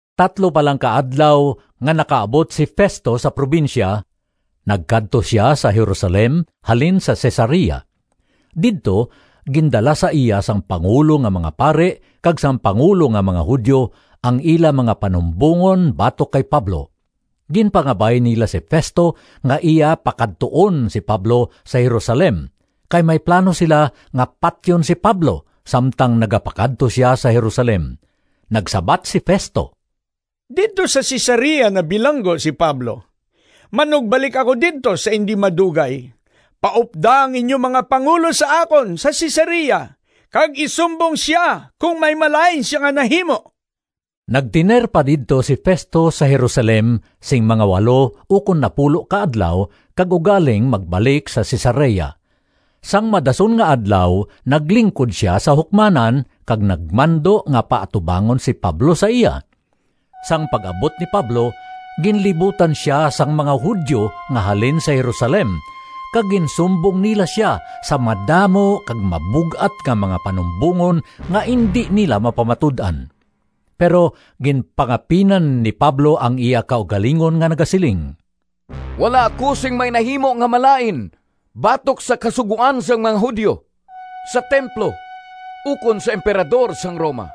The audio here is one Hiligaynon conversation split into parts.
Tatlo pa lang ka adlaw nga nakaabot si Festo sa probinsya, nagkadto sia sa Jerusalem halin sa Cesarea. Didto gindala sa iya sang pangulo nga mga pari kag sang pangulo nga mga Judio ang ila mga panumbongon batok kay Pablo. Ginpangabay nila si Festo nga iya pakadtuon si Pablo sa Jerusalem kay may plano sila nga patyon si Pablo samtang nagapakadto sia sa Jerusalem. Nagsabat si Festo, “Didto sa Cesarea nabilanggo si Pablo. Manugbalik ako didto sa indi madugay. Paupda ang inyo mga pangulo sa akon sa Cesarea kag isumbong sia kon may malain sia nga nahimo.” Nagtener pa didto si Festo sa Jerusalem sing mga walo ukon napulo ka adlaw kag ugaling magbalik sa Cesarea. Sang madason nga adlaw naglingkod sia sa hukmanan kag nagmando nga paatubangon si Pablo sa iya. Sang pag-abot ni Pablo, ginlibutan sia sang mga Judio nga halin sa Jerusalem kag ginsumbong nila sia sa madamo kag mabug-at nga mga panumbongon nga indi nila mapamatud-an. Pero ginpangapinan ni Pablo ang iya kaugalingon nga nagasiling, “Wala ako sing may nahimo nga malain batok sa Kasugoan sang mga Judio, sa templo, ukon sa Emperador sang Roma.”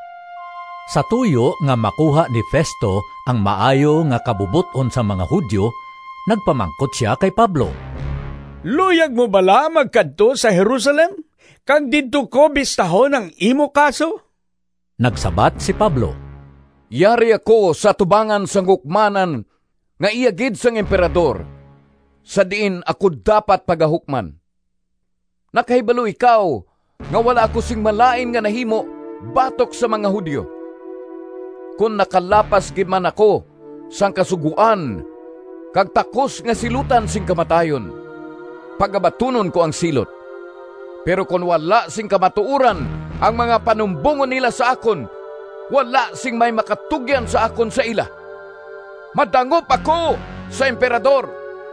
Sa tuyo nga makuha ni Festo ang maayo nga kabubot-on sang mga Judio nagpamangkot sia kay Pablo, “Luyag mo bala magkadto sa Jerusalem kag didto ko bistahon ang imo kaso?” Nagsabat si Pablo, “Yari ako sa atubangan sang hukmanan nga iya gid sang Emperador sa diin ako dapat pagahukman. Nakahibalo ikaw nga wala ako sing malain nga nahimo batok sa mga Judio. Kon nakalapas gid man ako sang kasugoan kag takos nga silutan sing kamatayon, pagabatunon ko ang silot. Pero kon wala sing kamatuoran ang mga panumbongon nila sa akon, wala sing may makatugyan sa akon sa ila. Madangop ako sa Emperador.”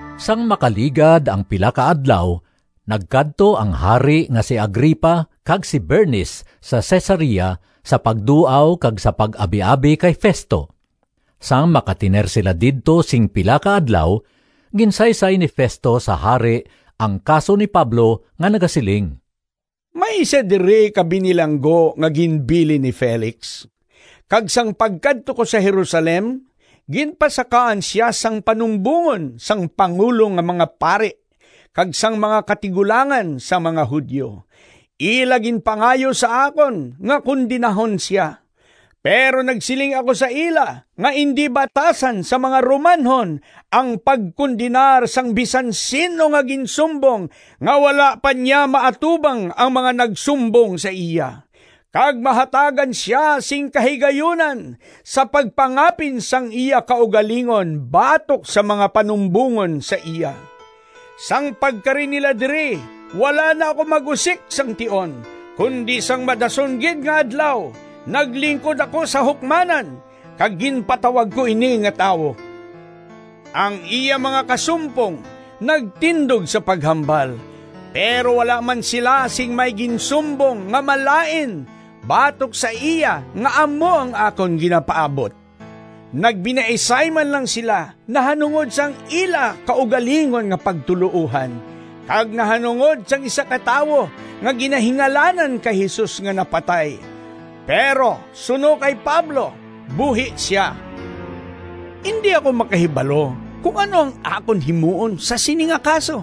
Sang makaligad ang pila ka adlaw nagkadto ang hari nga si Agripa kag si Bernice sa Cesarea sa pagduaw kag sa pag-abiabi kay Festo. Sang makatener sila didto sing pila ka adlaw, ginsaysay ni Festo sa hari ang kaso ni Pablo nga nagasiling, “May isa diri ka binilanggo nga ginbilin ni Felix kag sang pagkadto ko sa Jerusalem, ginpasakaan sia sang panumbongon sang pangulo nga mga pari kag sang mga katigulangan sang mga Judio. Ila ginpangayo sa akon nga kondenahon sia. Pero nagsiling ako sa ila nga indi batasan sang mga Romanhon ang pagkondenar sang bisan sin-o nga ginsumbong nga wala pa niya maatubang ang mga nagsumbong sa iya, kag mahatagan sia sing kahigayunan sa pagpangapin sang iya kaugalingon batok sa mga panumbongon sa iya. Sang pagkari nila diri wala na ako mag-usik sang tion, kundi sang madason gid nga adlaw naglingkod ako sa hukmanan kag ginpatawag ko ini nga tawo. Ang iya mga kasumpong nagtindog sa paghambal, pero wala man sila sing may ginsumbong nga malain batok sa iya nga amo ang akon ginapaabot. Nagbinaisay man lang sila nahanungod sang ila kaugalingon nga pagtuloohan kag nahanungod sang isa ka tawo nga ginahingalanan kay Jesus nga napatay, pero suno kay Pablo buhi sia. Indi ako makahibalo kon ano ang akon himuon sa sini nga kaso,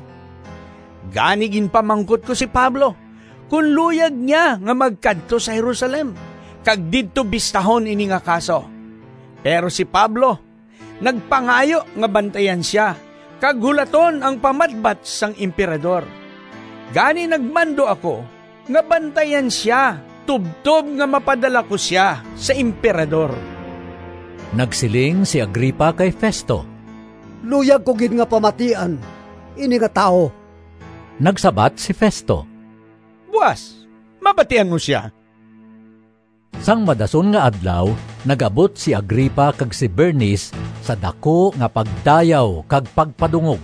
gani ginpamangkot ko si Pablo kon luyag niya nga magkadto sa Jerusalem kag didto bistahon ini nga kaso. Pero si Pablo nagpangayo nga bantayan sia kag hulaton ang pamatbat sang Emperador. Gani nagmando ako nga bantayan sia tubtob nga mapadala ko sia sa Emperador.” Nagsiling si Agripa kay Festo, “Luyag ko gid nga pamatian ini nga tawo.” Nagsabat si Festo, “Buas mabatian mo sia.” Sang madason nga adlaw nag-abot si Agripa kag si Bernice sa daku nga pagdayaw kag pagpadungog,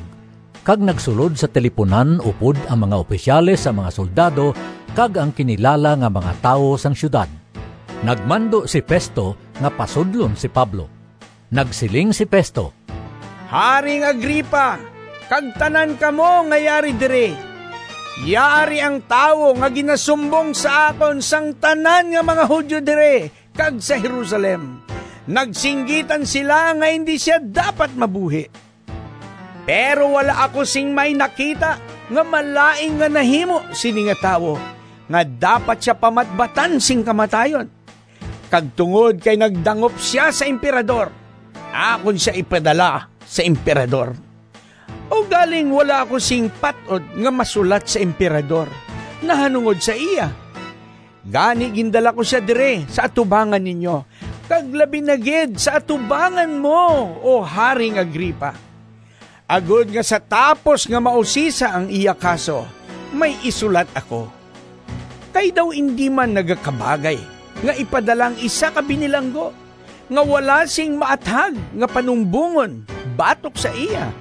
kag nagsulod sa tilipunan upod ang mga opisyales sang mga soldado kag ang kinilala nga mga tawo sang siyudad. Nagmando si Festo nga pasudlon si Pablo. Nagsiling si Festo, “Haring Agripa, kag tanan kamo nga yari diri: Yari ang tawo nga ginasumbong sa akon sang tanan nga mga Judio diri kag sa Jerusalem. Nagsinggitan sila nga indi sia dapat mabuhi. Pero wala ako sing may nakita nga malain nga nahimo sini nga tawo nga dapat sia pamatbatan sing kamatayon. Kag tungod kay nagdangop sia sa Emperador, akon sia ipadala sa Emperador. Ugaling wala ako sing pat-od nga masulat sa Emperador nahanungod sa iya. Gani gindala ko sia diri sa atubangan ninyo, kag labi na gid sa atubangan mo, O Haring Agripa, agod nga sa tapos nga mausisa ang iya kaso, may isulat ako. Kay daw indi man nagakabagay nga ipadala ang isa ka binilanggo nga wala sing maathag nga panumbongon batok sa iya.”